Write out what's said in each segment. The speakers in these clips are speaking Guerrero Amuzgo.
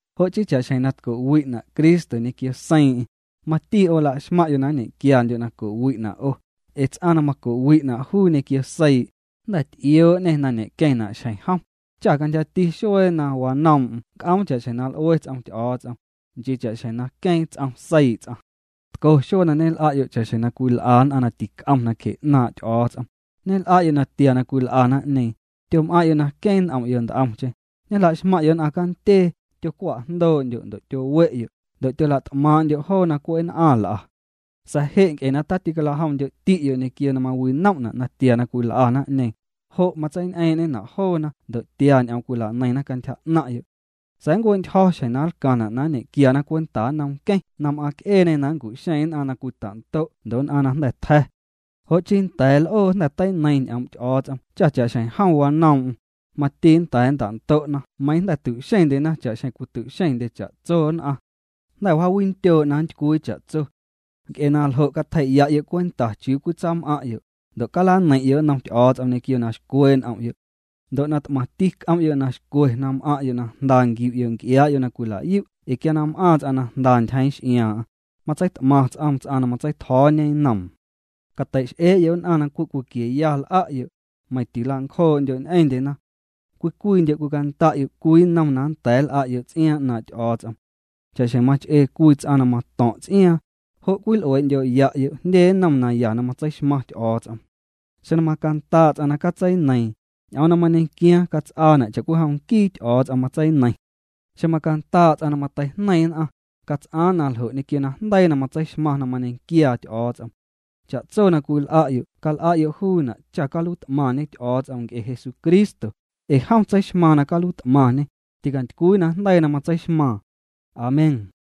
Jo' chii, cha'xjeⁿ na tco'wi'na' Cristo ñequio seiiⁿ'eⁿ, mati 'o la'xmaⁿ'yo' na nñequiandyo' na co'wi'na' 'o, ee ts'aⁿ na maco'wi'na' juu ñequio seii', jnda̱ ty'ioo'ñê na ñe'queⁿ jnaⁿ xjeⁿ jom, cha cantyjati xuee na wañoom'm nnc'oom cha'xjeⁿ na l'ue ts'om Ty'o̱o̱ts'om, nchii cha'xjeⁿ na queeⁿ ts'om seii' ts'aⁿ. Tco xuee na ñel'a'yo' cha'xjeⁿ cwil'a nn'aⁿ na tic'om nacje 'naaⁿ' Ty'o̱o̱ts'om, ñel'a'yo' natia na cwil'a naⁿ'ñeeⁿ, tyom'aⁿ'yo' na queeⁿ n'om'yo' nt'omcheⁿ, ñejla'xmaⁿ'yo' nn'aⁿ candyee, tyocwa'jndoo'ndyo' ndo' tyowe'yo', ndo' tyola't'maaⁿ'ndyo' joo na cwe' nn'aⁿ l'a. Sa̱a̱ je' nc'e na ticalajomndyo'ti'yo' ñequio na mawinom'na' natia na cwil'a naⁿ'ñeeⁿ, jo' matseiñ'eeⁿ'ñena' joona ndo' tia ñ'oom cwilaneiⁿna cantyja 'naⁿ'yo'. Sa̱a̱ ncue'ntyjo̱ xjeⁿ na nlcaⁿna' na nñequiana cwenta nnom Nqueⁿ na m'aaⁿc'eeñê na nncu'xeeⁿ nn'aⁿ na cwita'ndo' ndo' nn'aⁿ na jnda̱ tja̱. Jo' chii nda̱a̱ l'oo jnda̱ teineiⁿ ñ'oom' Ty'o̱o̱ts'om cha cha'xjeⁿ jom wanoom'm, mati nnda̱a̱ nnta'ndo'na meiiⁿ jnda̱ tu'xeⁿndyena cha'xjeⁿ cwitu'xeⁿndye cha'tso nn'aⁿ. Jnda̱ wjaawindyoo' na nntycwii cha'tso. Nc'e na ljo' catjei'ya'yo' cwenta chiuu cwitsam'aⁿ'yo', ndo' calaneiⁿ'yo' nnom Ty'o̱o̱ts'om ñequio na xcwee' n'om'yo'. Ndo' na t'maⁿti c'om'yo' na xcwe na m'aⁿ'yo' na jnda nquiu'yo' nc'iaa'yo' na cwilayu' ee quia na m'aaⁿ ts'aⁿ na jnda ntyjeeⁿ x'iaaⁿ'aⁿ, matseit'maⁿya ts'oom ts'aⁿ na matseitjo̱o̱ñe nnoom. Cateix'ee'yo' nn'aⁿ na cwe' cwiquieya l'a'yo', meiⁿ tila'ncjoo'ndyo' ñ'eⁿndyena. Cwii cwiindyo' cwicanda'yo' cwii nnom na nnda̱a̱ nl'a'yo' ts'iaaⁿ 'naaⁿ' Ty'o̱o̱ts'om. Cha'xjeⁿ mach'ee cwii ts'aⁿ na mato̱ⁿ' ts'iaaⁿ, jo' cwil'uee'ndyo'ya'yo' jndye nnom naya na matseixmaⁿ Ty'o̱o̱ts'om. Xeⁿ macandaa' ts'aⁿ na catseineiiⁿ, ñ'oom na mañequiaaⁿ cats'aana' cha'cwijom nquii Ty'o̱o̱ts'om matseineiⁿ. Xeⁿ macandaa' ts'aⁿ na mateijneiⁿ nn'aⁿ, cats'aaⁿ naljo' ñequio najndeii na matseixmaaⁿ na mañequiaa Ty'o̱o̱ts'om. Cha'tso na cwil'a'yo' cal'a'yo' juuna' cha caluiit'maⁿñe Ty'o̱o̱ts'om nc'e Jesucristo, ee jom tseixmaaⁿ na caluiit'maⁿñê, ticantycwii najndeii na matseixmaaⁿ. Amén.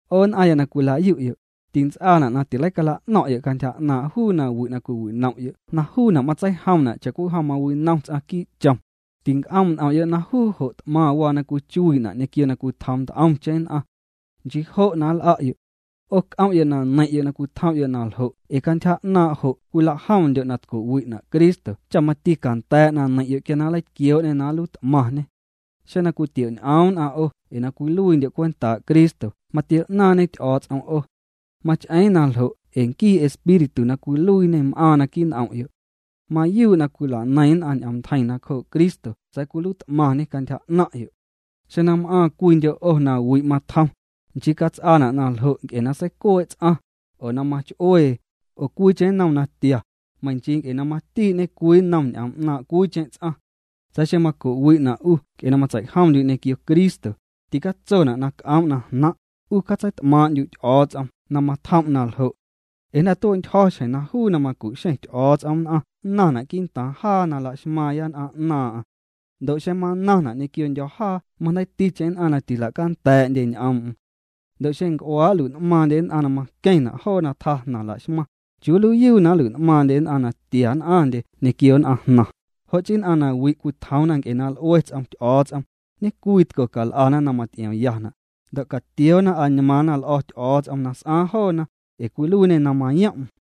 'O nn'aⁿya na cwila'yu'yo', tints'aana' na tileicala'no̱ⁿ'yo' cantyja 'naaⁿ' juu na wi' na cwiwinom'yo' na juuna' matseijomna' cha'cwijom mawinom ts'aⁿ quii' chom, tinc'oom' n'om'yo' na juu jo' t'maⁿ waa na cwichuii'na' ñequio na cwitjoom nt'omcheⁿ nn'aⁿ. Nchii jo' na nl'a'yo'. 'O c'om'yo' na neiⁿ'yo' na cwitjom'yo' na ljo' ee cantyja 'naaⁿ' jo' cwilajomndyo' na tco'wi'na' Cristo cha mati canda̱a̱' na neiⁿ'yo' quia na nleitquioo'ñê na nluiit'maⁿñê. Xeⁿ na cwitio'ñ'oom nn'aⁿ 'o ee na cwiluiindyo' cwentaa' Cristo matio'naaⁿñe Ty'o̱o̱ts'om 'o. Mach'eeⁿ na ljo' ee nquii Espíritu na cwiluiiñê m'aaⁿ naquii' n'om'yo'. Mayuu' na cwilaneiⁿna ñ'oom ntjeiⁿ nacjoo' Cristo sa̱a̱ cwiluiit'maⁿñê cantyja 'naⁿ'yo'. Xeⁿ na m'aaⁿ cwiindyo' 'o na wi' matjom, nchii cats'aana' na ljo' nc'e na seicuee' ts'aⁿ, oo na mach'uee, oo cwiicheⁿ nnom natia, meiⁿ nchii nc'e na matii'ñe cwii nnom ñ'oom 'naaⁿ' cwiicheⁿ ts'aⁿ. Sa̱a̱ xeⁿ maco'wi'na' 'u nc'e na matseijomndyu' ñequio Cristo, ticatsona' na c'oom' na jnaⁿ', 'u catseit'maaⁿ'ndyu' Ty'o̱o̱ts'om na matjom' naljo'. Ee jnda̱ tue'ntyjo̱ xjeⁿ na juu na macu'xeⁿ Ty'o̱o̱ts'om nn'aⁿ nnaⁿna quii'ntaaⁿ jaa na laxmaaⁿya nn'aⁿ 'naaⁿ'aⁿ. Ndo' xeⁿ manaⁿna' ñequiondyo̱ jaa majndeiiticheⁿ nn'aⁿ na tilacanda̱a̱'ndye ñ'oom'm. Ndo' xeⁿ nc'uaa' nlui'n'maaⁿndye nn'aⁿ na maqueⁿna' joo na tjaa jnaⁿ laxmaⁿ, ¿chiuu nluiiyuu na nlui'n'maaⁿndye nn'aⁿ na tia nn'aⁿndye ñequio nn'aⁿ jnaⁿ? Jo' chii nn'aⁿ na wi' cwitjoomna nc'e na l'ue ts'om Ty'o̱o̱ts'om, ñecwitco cal'ana na maty'iomyana', ndo' catioona añmaaⁿna l'o̱ Ty'o̱o̱ts'om na s'aa joona, ee cwiluiiñê na mayom'm.